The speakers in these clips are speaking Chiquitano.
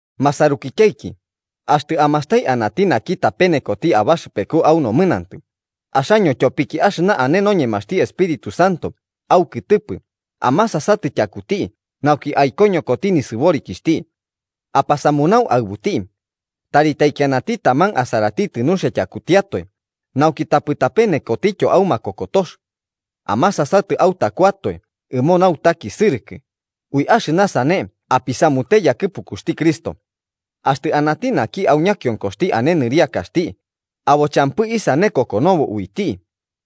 Masarukityaiki, axtɨ amastai anati naki tapenekoti abaxɨpeku au nomɨnantɨ, axaño tyopiki axɨna ane noñemaxti Espíritu Santo aukɨtɨpɨ amasasatɨ tyakuti nauki aikoñokoti nisɨborikixhti. Apasamunau aɨbuti. Tari taikianati taman asaratitɨ nuxia tyakutiatoe, nauki tapɨ tapenekotityo au makokotox. Amasasatɨ autakuatoe ɨmo nautakisɨrɨkɨ, ui axɨna sane apisamute yakɨpukuxti Cristo. Axtɨ anati naki au ñakionkoxti ane nɨriakaxti, abo champɨ isane kokonobo uiti,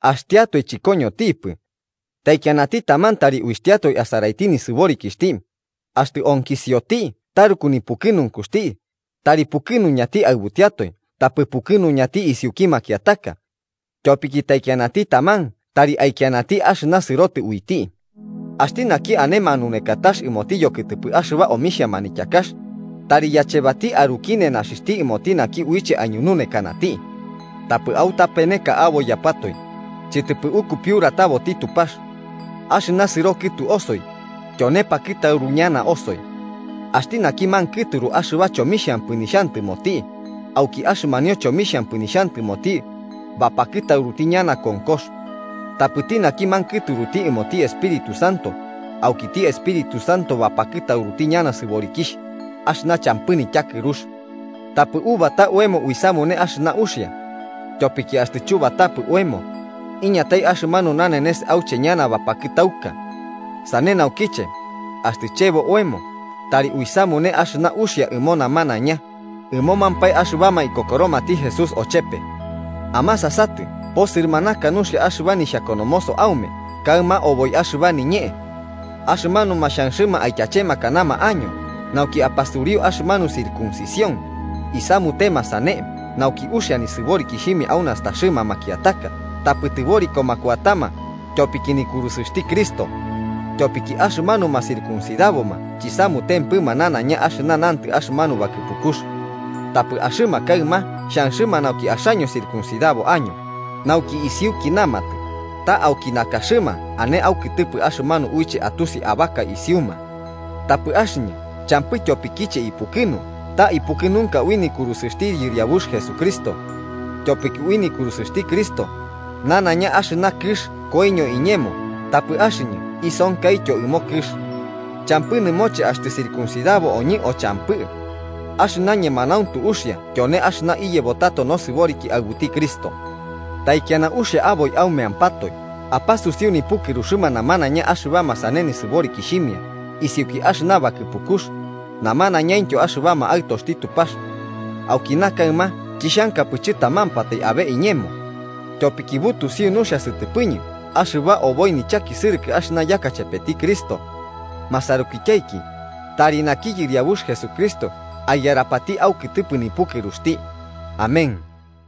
axtiatoe chɨkoñontipɨ. Taikianati taman tari uitiatoe asaraiti nisɨborikixhti, axtɨ onkisioti taruku nipukɨnunkuxti, tari pukɨnuñati aɨbutiatoe tapɨ pukɨnuñati isiuki makiataka. Tyopiki taikianati taman tari aikianti axɨna sɨrobotɨ uiti. Axti naki ane manunekatax ɨmoti yokɨtɨpɨ axɨba omixhia manityakax, tari yachebati aruki nenaxixhti ɨmoti naki uiche aiñununekanati. Tapɨ autapeneka aboiyapatoe: chɨtɨpɨ ukupiurataboti Tupax. Axɨna sɨro kɨtu osoi, tyone pakɨtauru ñana osoi. Axti naki mankɨturuti axɨba chomixhampɨ nixhantɨmoti, auki axɨmanio chomixhampɨ nixhantɨmoti, bapakɨtauruti ñana konkox. Tapɨti naki mankɨturuti ɨmoti Espíritu Santo, aukiti Espíritu Santo bapakɨtauruti ñana sɨborikixh axɨna champɨ nityakɨrux. Tapɨ ubata oemo uisamune axɨna uxia. Tyopiki axtɨ chubatapɨ oemo, iñatai axɨmanu nanenes auche ñana bapakɨtauka. Sane naukiche, axtɨ chebo oemo, tari uisamune axɨna uxia ɨmo namanaiña, ɨmomampae axɨbama ikokoromati Jesús ochepe. ¡Amasasatɨ posɨrɨmanaka nuxia axɨba nixhakonomoso aume kaɨma oboi axɨba niñee! Axɨmanuma xhanxɨma aityachemakanama año nauki apasuriu axɨmanu circuncisión, isamutema sane nauki uxia nisɨborikixhimia au nastaxɨma makiataka tapɨ tɨborikoma kuatama tyopiki nikurusɨxti Cristo. Tyopiki axɨmanuma circuncidaboma chisamutempɨma nanaiña axɨna nantɨ axɨmanu bakɨpukux. Tapɨ axɨma kaɨma xhanxɨma nauki axaño circuncidabo año, nauki isiuki namatɨ ta auki nakaxɨma ane aukɨtɨpɨ axɨmanu uiche atusi ta abaka isiuma. Tapɨ axɨñɨ champɨ tyopikiche ipukɨnu ta ipukɨnunka ui nikurusɨxti Yɨriabux Jesucristo. Tyopiki ui nikurusɨxti Cristo, nanaiña axɨna kɨx koiño iñemo tapɨ axɨñɨ isonkaityo ɨmo kɨx. Champɨ nɨmoche axtɨ circuncidabo oñɨ o champɨ. Axɨna ñemanauntu uxia tyone axɨna iyebo tato nosɨboriki aɨbuti Cristo. Taikiana uxia aboi aumeampatoe apasusiu nipukɨruxɨma namanaiña axɨbama sane nisɨborikixhimia isiuki axɨna bakɨpukux, namanaiñaintyo axɨbama Aɨtoxti Tupax. Aukina kaɨma chixhankapɨ chɨtamampatai abe iñemo. Tyopiki butusiu nuxia sɨtɨpɨñɨ axɨba oboi nichakisɨrɨkɨ axɨna yaka chepeti Cristo. Masarukityaiki, tari naki Yɨriabux Jesucristo aiyarapati aukɨtɨpɨ nipukɨruxti. Amén.